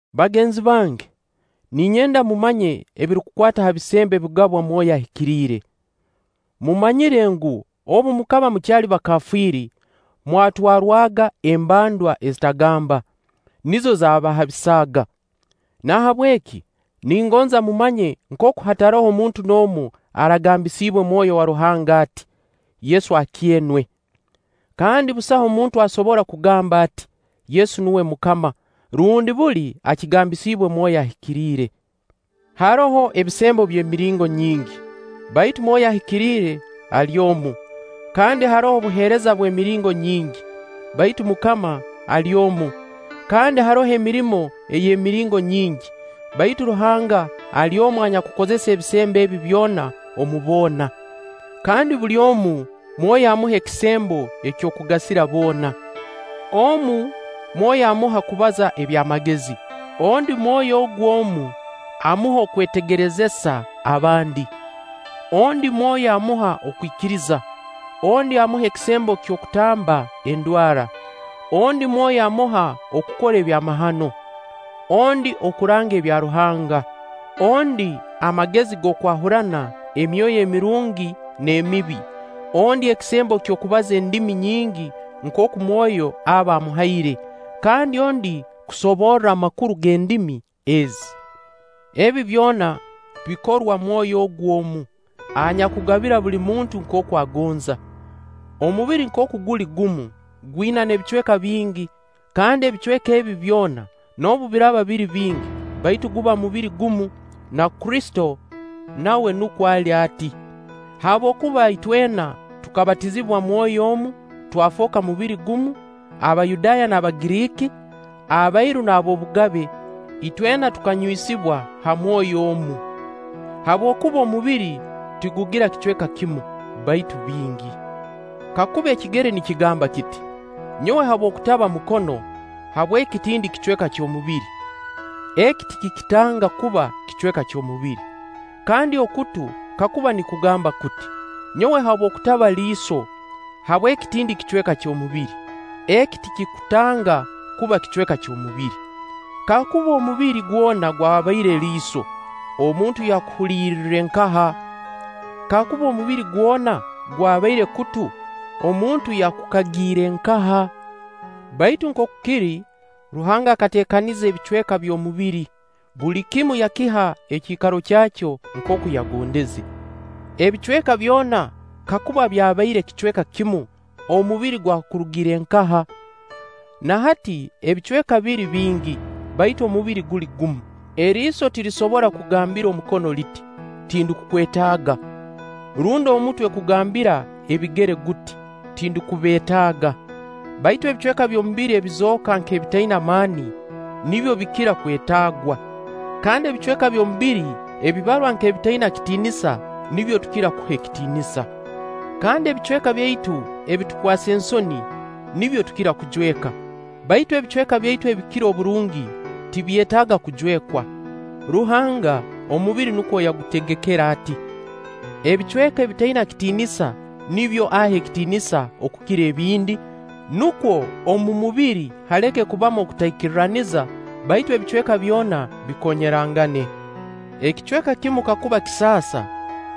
Bagenzi bange, ninyenda mumanye ebirukukwata ha bisembo ebigabwa mwoyo Ahikiriire. Mumanyire ngu, obu mukaba mukyali bakafiiri, mwatwarwaga embandwa ezitagamba, nizo zaabahabisaaga. Nahabweki ningonza mumanye nkooku hataroho muntu n'omu aragambisiibwe Mwoyo wa Ruhanga ati: “Yesu akyenwe!” Kandi busaho muntu asobora kugamba ati: “Yesu nuwe MUKAMA”, rundi buli akigambisibwe Mwoyo Ahikiriire. Haroho ebisembo eby'emiringo nyingi, baitu Mwoyo Ahikiriire ali omu; kandi haroho obuheereza bw'emiringo nyingi, baitu MUKAMA ali omu; Kandi haroho emirimo ey'emiringo nyingi, baitu Ruhanga ali omu anyakukozesa ebisembo ebi byona omu boona. Kandi buli omu Mwoyo amuha ekisembo eky'okugasira boona. Omu, Mwoyo amuha kubaza eby'amagezi; ondi Mwoyo ogu omu, amuha okwetegerezesa abandi. Ondi Mwoyo amuha okwikiriza, ondi amuha ekisembo ky'okutamba endwara. Ondi Mwoyo amuha okukora ebyamahano, ondi okuranga ebya Ruhanga, ondi amagezi g'okwahurana emyoyo emirungi n'emibi, ondi ekisembo ky'okubaza endimi nyingi nkooku Mwoyo aba amuhaire, kandi ondi kusoborra amakuru g'endimi ezi. Ebi byona bikorwa Mwoyo ogu omu, anyakugabira buli muntu nkooku agonza. Omubiri nkooku guli gumu, gwina n'ebicweka bingi, kandi ebicweka ebi byona noobu biraaba biri bingi, baitu guba mubiri gumu, na Kristo nawe nukwo ali ati, Habwokuba itwena tukabatizibwa mwoyo omu, twafooka mubiri gumu-Abayudaaya n'Abagiriiki, abairu n'ab'obugabe-itwena tukanywisibwa ha mwoyo omu. Habwokuba omubiri tigugira kicweka kimu, baitu bingi. Kakuba ekigere nikigamba kiti: “Nyowe habw'okutaba mukono, habweki tindi kicweka ky'omubiri,” eki tikikitanga kuba kicweka ky'omubiri. Kandi okutu kakuba nikugamba kuti: “Nyowe habw'okutaba liiso, habweki tindi kicweka ky'omubiri,” eki tikikutanga kuba kicweka ky'omubiri. Kakuba omubiri gwona gwabaire liiso, omuntu yakuhuliriire nkaha? Kakuba omubiri gwona gwabaire kutu, omuntu yakukagiire nkaha? Baitu nkooku kiri, Ruhanga akateekaniza ebicweka by'omubiri, buli kimu yakiha ekiikaro kyakyo nkooku yagondeze. Ebicweka byona kakuba byabaire kicweka kimu, omubiri gwakurugire nkaha? Na hati ebicweka biri bingi, baitu omubiri guli gumu. Eriiso tirisobora kugambira omukono liti: “Tindukukwetaaga”; rundi omutwe kugambira ebigere guti: “Tindukubeetaaga”. Baitu ebicweka by'omubiri ebizooka nk'ebitaina maani, nibyo bikira kwetaagwa. Kandi ebicweka by'omubiri ebibarwa nk'ebitaina kitiinisa, nibyo tukira kuha ekitiinisa. Kandi ebicweka byaitu ebitukwasa ensoni, nibyo tukira kujweka; baitu ebicweka byaitu ebikira oburungi, tibyetaaga kujwekwa. Ruhanga, omubiri nukwo yagutegekere ati: Ebicweka ebitaina kitiinisa nibyo aha ekitiinisa okukira ebindi, nukwo omu mubiri haleke kubamu okutaikirraniza, baitu ebicweka byona bikoonyerangane. Ekicweka kimu kakuba kisaasa,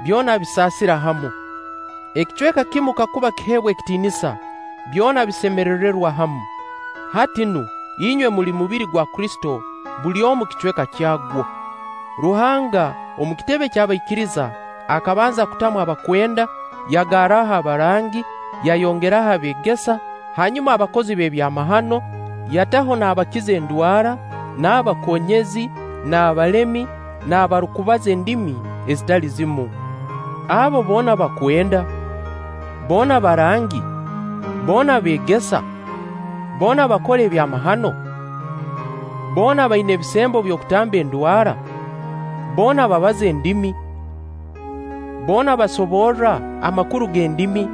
byona bisaasira hamu. Ekicweka kimu kakuba kiheebwa ekitiinisa, byona bisemerererwa hamu. Hati nu inywe muli mubiri gwa Kristo, buli omu kicweka kyagwo. Ruhanga, omu kitebe ky'abaikiriza, akabanza kutamu abakwenda, yagarraho abarangi, yayongeraho ebeegesa, hanyuma abakozi b'ebyamahano, yataho n'abakiza endwara, n'abakoonyezi, n'abalemi, n'abarukubaza endimi ezitali zimu. Abo boona bakwenda? Boona barangi? Boona beegesa? Boona bakora ebyamahano? Boona baina ebisembo by'okutamba endwara? Boona babaza endimi? Boona basoborra amakuru g'endimi?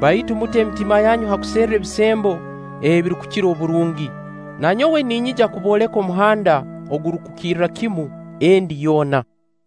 Baitu mute emitima yanyu ha kuserra ebisembo ebirukukira oburungi. Nanyowe ninyija kubooleka omuhanda ogurukukirra kimu endi yoona.